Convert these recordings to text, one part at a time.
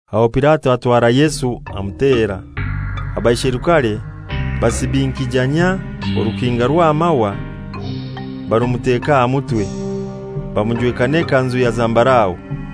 Aho Pilato atwara Yesu amutera. Abaisherukare basibinkijanyia orukinga rw'amahwa barumuteka aha mutwe, bamujweka n'ekanzu ya zambarau.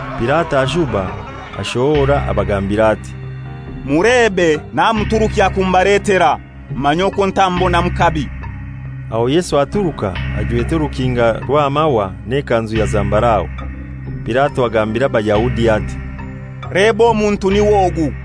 Pilato ashuba ashohora abagambira ati, «Mulebe namuturukya kumubaletera, mumanye okwo ntamubonamu kabi.» Aho Yesu aturuka ajwete orukinga rw'amahwa n'ekanzu ya zambarau. Pilato agambira Abayahudi ati, «Leba omuntu niw'ogu!»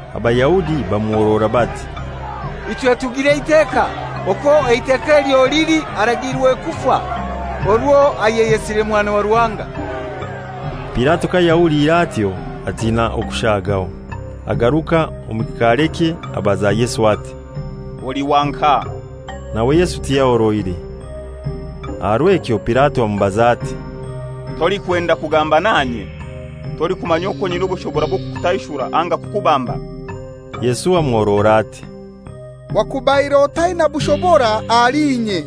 Abayahudi bamuhorora bati, «Ichwe tugira eiteka, okwo eiteka elyo lili aragiirwe kufa, orwo ayeyesire Mwana wa Ruhanga.» Pilato kayahuliire atyo atina okushagaho. Agaruka omu kikaarekye abaza Yesu ati, «Oli wa nkahai?» Nawe Yesu tiyahoroire. Aha rw'ekyo Pilato amubaza ati, «Tolikwenda kugamba nanye? Tolikumanya okwo nyina obushobora bw'okukutaishura anga kukubamba?» Yesu amuhorora ati, «Wakubaire otaina bushobora ahali inye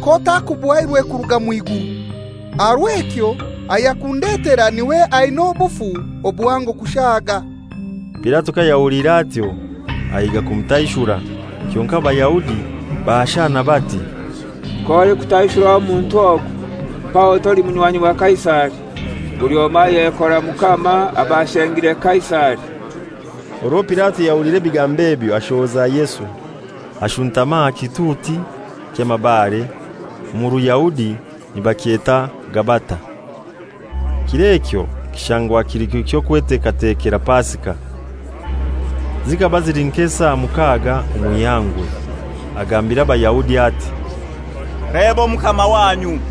k'otakubuhairwe kuruga mw'iguru. Aha rw'ekyo ayakundetera n'iwe aina obufu obuhango kushaaga.» Pilato kayahuliire atyo ahiiga kumutaishura, kyonkai Abayahudi baashana bati, «K'olikutaishura omuntu ogu mpaho toli munywanyi wa Kaisari. Buli omoi ayekora mukama aba ashengire Kaisari.» Orwo Pilato yahuliire ebigambo ebyo ashohoza Yesu, ashuntama aha kituuti ky'amabare, omu Ruyahudi nibakyeta Gabata. Kir'ekyo kishangwa kili kiro ky'okweteekateekera Pasika; zikaba zili nk'esaa mukaaga omw'ihangwe. Agambira Abayahudi ati, «Leba Omukama wanyu!»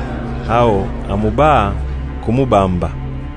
Aho amubaha kumubamba.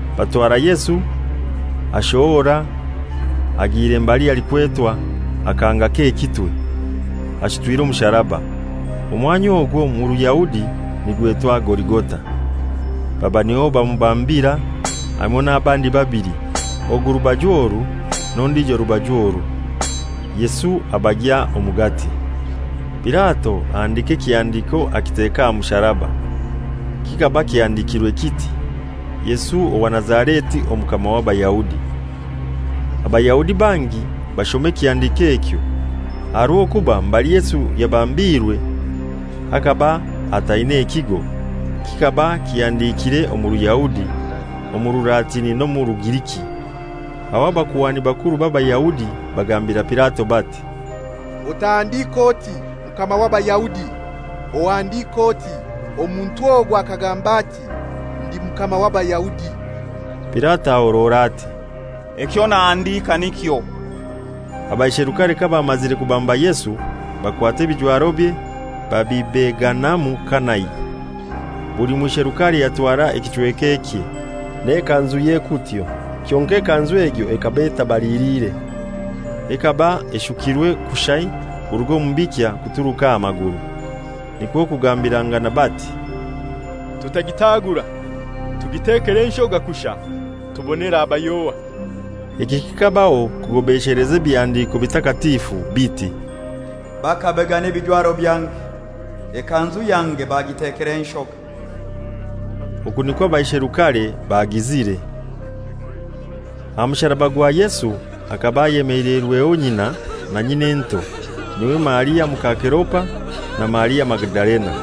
Batwara Yesu, ashohora agiire mbali halikwetwa «Akahanga k'ekitwe,» ashutwire omusaraba. Omwanya ogwo omu Ruyahudi nigwetwa Goligota. Baba niho bamubambira, hamoi n'abandi babili, ogu rubaju oru, n'ondijo rubaju oru, Yesu abagya omugati. Pilato ahandika ekihandiko akiteka aha musaraba; kikaba kihandikire kiti, «Yesu owa Nazareti Omukama w'Abayahudi.» Abayahudi bangi bashoma ekihandiko ekyo, aha rw'okuba mbali Yesu yabambiirwe bhakaba hataine ekigo; kikaba kihandikire omu Ruyahudi, omu Rulatini n'omu Rugiriki. Aho Abakuhani bakuru b'Abayahudi bagambira Pilato bati, «Otahandika oti, ‹Mukama w'Abayahudi,› ohandike oti, ‹Omuntu ogu akagamba ati: Ndi Mukama w'Abayahudi.›» Pilato ahorora ati, «Ekyo nahandika nikyo!» Abaisherukare kabamazire kubamba Yesu, bakwata ebijwarobye babibeganamu kanai; buli mwisherukale yatwara ekichweka ekye, n'ekanzuye kutyo. Kyonkai ekanzu egyo ekaba etabaliliire. Ekaba eshukirwe kushai kuruga omu bikya kuturuka aha maguru. Nikwo kugambirangana bati, «Tutagitagura, tugitekere enshoga kushai tubone eraba y'ohai.» Eki kikabaho kugobesheleza Ebihandiko Bitakatifu, biti, «Bakabegana ebijwaro byange, ekanzu yange bagitekera enshoga.» Oku nikwo abaisherukare bagizire. Aha musaraba gwa Yesu hakaba ayemeleirweho nyina, na nyin'ento, n'iwe Maria muka Keleopa, na Maria Magadalena.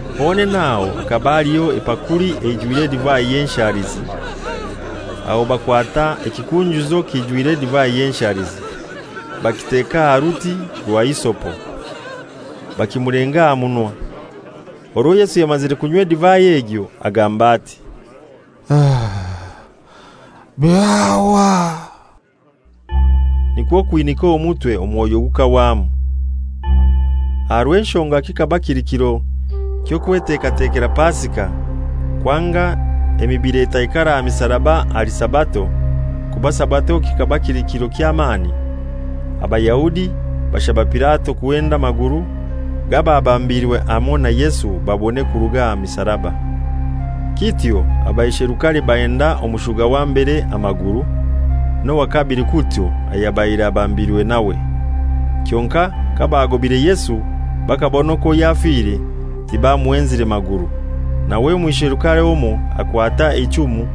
Honene aho hakaba haliho epakuli eijwire edivai y'enshalizi; aho bakwata ekikunjuzo kiijwire edivai y'enshalizi, bakiteka aha ruti rwa hisopo, bakimulenga aha munwa. Orwo Yesu yamazire kunywa edivai egyo, agamba ati, «Byahwa.» Nikwo kwinika omutwe, omwoyo gukahwamu. Aha rw'enshonga kikaba kili kiro ky'okwetekatekera Pasika, kwanga emibili etaikara aha misaraba ahali Sabato (kuba Sabato kikaba kili kiro ky'amani), Abayahudi bashaba Pilato kuhenda amaguru g'ababambirwe hamoi na Yesu babone kuruga aha misaraba. Kityo abaisherukare bahenda omushuga wa mbere amaguru, n'owa kabili kutyo ayabaire abambirwe nawe. Kyonkai kabaagobire Yesu bakabona okwo yafire, tibamuhenzire maguru. Nawe omwisherukare omoi akwata eichumu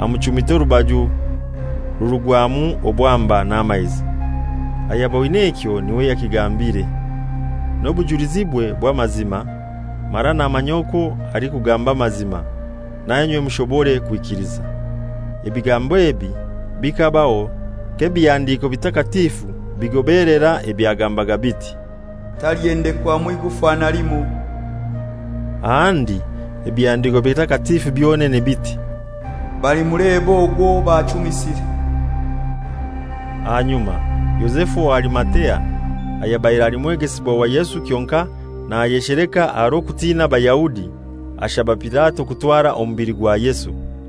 amuchumita orubaju rurugwamu obwamba n'amaizi. Ayaboine ekyo n'iwe yakigambire, n'obujulizibwe bw'amazima, mara namanya okwo alikugamba amazima, nainywe mushobore kwikiliza. Ebigambo ebi bikabaho k'Ebihandiko Bitakatifu bigobelera ebyagambaga biti, «Talihendekwamu igufa na limoi.» Ahandi Ebihandiko Bitakatifu byonene biti, «Balimuleba ogwo owo bachumisire.» Ahanyuma Yozefu owa Arimatea, ayabaire ali mwegesibwa wa Yesu kyonkai nayesheleka aha rw'okutina Abayahudi, ashaba Pilato kutwara omubili gwa Yesu.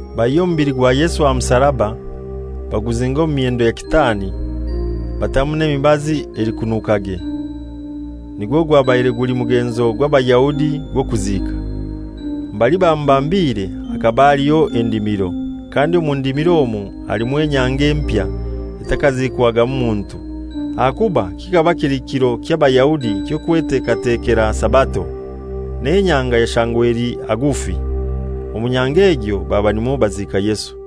Baihya omubili gwa Yesu aha musaraba, baguzinga omu myendo ya kitaani, batamu n'emibazi elikunukage, nigwo gwabaire guli mugenzo gw'Abayahudi gw'okuziika. Mbali bamubambire hakaba haliho endimiro, kandi omu ndimiro omwo alimu enyanga empya etakaziikwagamu muntu. Ahakuba kikaba kili kiro ky'Abayahudi ky'Okwetekatekera Sabato, n'enyanga yashangwa eli hagufi, omu nyanga egyo baba nimwo baziika Yesu.